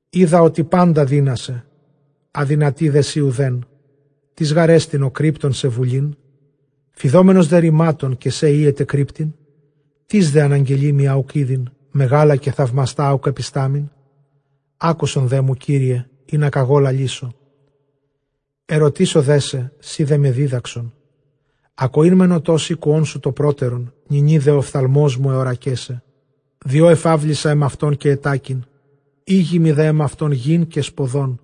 Οἶδα ὅτι πάντα δύνασαι, ἀδυνατεῖ δέ σοι οὐδέν. Τίς γάρ ἐστιν ὁ κρύπτων σε βουλήν; φειδόμενος δὲ ῥημάτων, καὶ σὲ οἴεται κρύπτειν; τίς δὲ ἀναγγελεῖ μοι ἃ οὐκ ᾔδειν, μεγάλα καὶ θαυμαστὰ ἃ οὐκ ἐπιστάμην; Ἄκουσον δέ μου Κύριε, ἵνα κᾀγὼ λαλήσω· ἐρωτήσω δέ σε, σὺ δέ με δίδαξον. Ἀκοὴν μὲν ὠτὸς ἤκουόν σου τὸ πρότερον, νυνὶ δὲ ὁ ὀφθαλμός μου ἑώρακέ σε. Διὸ ἐφαύλισα ἐμαυτὸν, καὶ ἐτάκην· ἥγημαι δὲ ἐμαυτὸν γῆν καὶ σποδόν.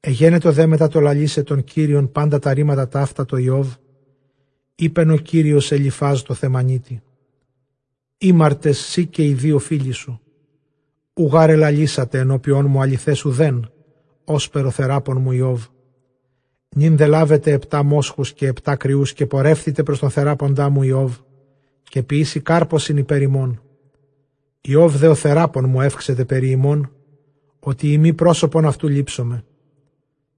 Ἐγένετο δὲ μετὰ τὸ λαλῆσαι τὸν Κύριον πάντα τὰ ῥήματα ταῦτα τῷ Ἰώβ, εἶπεν ὁ Κύριος Ἐλὺιφὰς τῷ Θαιμανὺίτῃ, ἥμαρτες σὺ, καὶ οἱ δὺο φίλοι σου· οὐ γὰρ ἐλαλήσατε ἐνώπιόν μου ἀληθὲς οὐδὲν, ὥσπερ ὁ θεράπων μου Ἰώβ. Νῦν δὲ λάβετε ἑπτὰ μόσχους, καὶ ἑπτὰ κριοὺς, καὶ πορεύθητε πρὸς τὸν θεράποντά μου Ἰὼβ, καὶ ποιήσει κάρπωσιν ὑπὲρ ὑμῶν. Ἰὼβ δὲ ὁ θεράπων μου εὔξεται περὶ ὑμῶν, ὅτι εἰ μὴ πρόσωπον αὐτοῦ λήψομαι·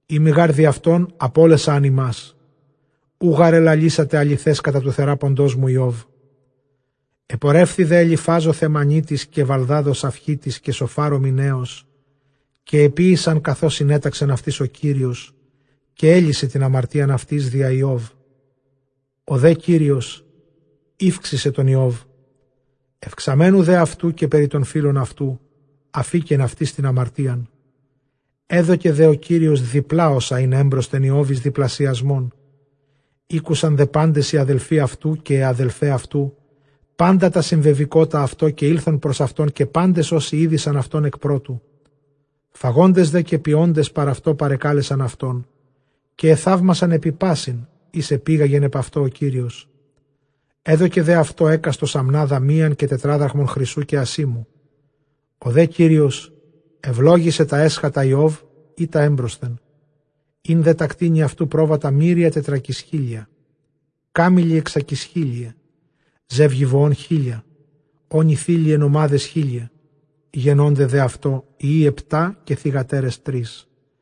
εἰ μὴ γὰρ διʼ αὐτὸν, ἀπώλεσα ἂν ὑμᾶς· οὐ γὰρ ἐλαλήσατε ἀληθὲς κατὰ τοῦ θεράποντός μου Ἰώβ. Ἐπορεύθη δὲ Ἐλιφὰζ ὁ Θαιμανίτης, καὶ Βαλδὰδ ὁ Σαυχίτης, καὶ Σωφὰρ ὁ Μιναῖος, καὶ ἐποίησαν καθὼς συνέταξεν αὐτοῖς ὁ Κύριος· καὶ ἔλυσε τὴν ἁμαρτίαν αὐτοῖς διὰ Ἰὼβ. Ὁ δὲ Κύριος ηὔξησε τὸν Ἰώβ· εὐξαμένου δὲ αὐτοῦ καὶ περὶ τῶν φίλων αὐτοῦ, ἀφῆκεν αὐτοῖς τὴν ἁμαρτίαν· ἔδωκε δὲ ὁ Κύριος διπλᾶ, ὅσα ἦν ἔμπροσθεν Ἰὼβ εἰς διπλασιασμόν. Ἤκουσαν δὲ πάντες οἱ ἀδελφοὶ αὐτοῦ καὶ αἱ ἀδελφαὶ αὐτοῦ πάντα τὰ συμβεβηκότα αὐτῷ, καὶ ἦλθον πρὸς αὐτὸν, καὶ πάντες ὅσοι ᾔδεισαν αὐτὸν ἐκ πρώτου· φαγόντες δὲ καὶ πιόντες παρʼ αὐτῷ παρεκάλεσαν αὐτὸν, καὶ ἐθαύμασαν ἐπὶ πᾶσιν οἷς ἐπήγαγεν ἐπʼ αὐτῷ ὁ Κύριος· ἔδωκε δὲ αὐτῷ ἕκαστος ἀμνάδα μίαν, καὶ τετράδραχμον χρυσοῦ καὶ ἀσήμου. Ὁ δὲ Κύριος εὐλόγησε τὰ ἔσχατα Ἰὼβ, ἢ τὰ ἔμπροσθεν· ἦν δὲ τὰ κτήνη αὐτοῦ, πρόβατα μύρια τετρακισχίλια, κάμηλοι ἑξακισχίλιαι, ζεύγη βοῶν χίλια, ὄνοι θήλειαι νομάδες χίλιαι. Γεννῶνται δὲ αὐτῷ υἱοὶ ἑπτὰ, καὶ θυγατέρες τρεῖς.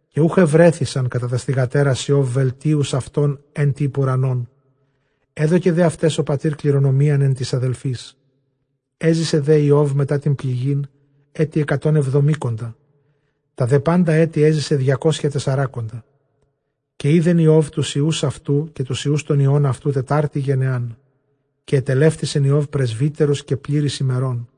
Καὶ οὐχ εὑρέθησαν κατὰ τὰς θυγατέρας Ἰὼβ, βελτίους αὐτῶν ἐν τῇ ὑπʼ οὐρανόν· ἔδωκε δὲ αὐταῖς ὁ πατὴρ κληρονομίαν ἐν τοῖς ἀδελφοῖς. Ἔζησε δὲ Ἰὼβ μετὰ τὴν πληγὴν ἔτη ἑκατὸν ἑβδομήκοντα· τὰ δὲ πάντα ἔτη ἔζησε, διακόσια τεσσράκοντα· καὶ Σἴδεν Ἰὼβ τοὺς υἱοὺς αὐτοῦ, καὶ τοὺς υἱοὺς τῶν υἱῶν αὐτοῦ, τετάρτην γενεάν. Καὶ ἐτελεύτησεν Ἰὼβ πρεσβύτερος, καὶ πλήρης ἡμερῶν·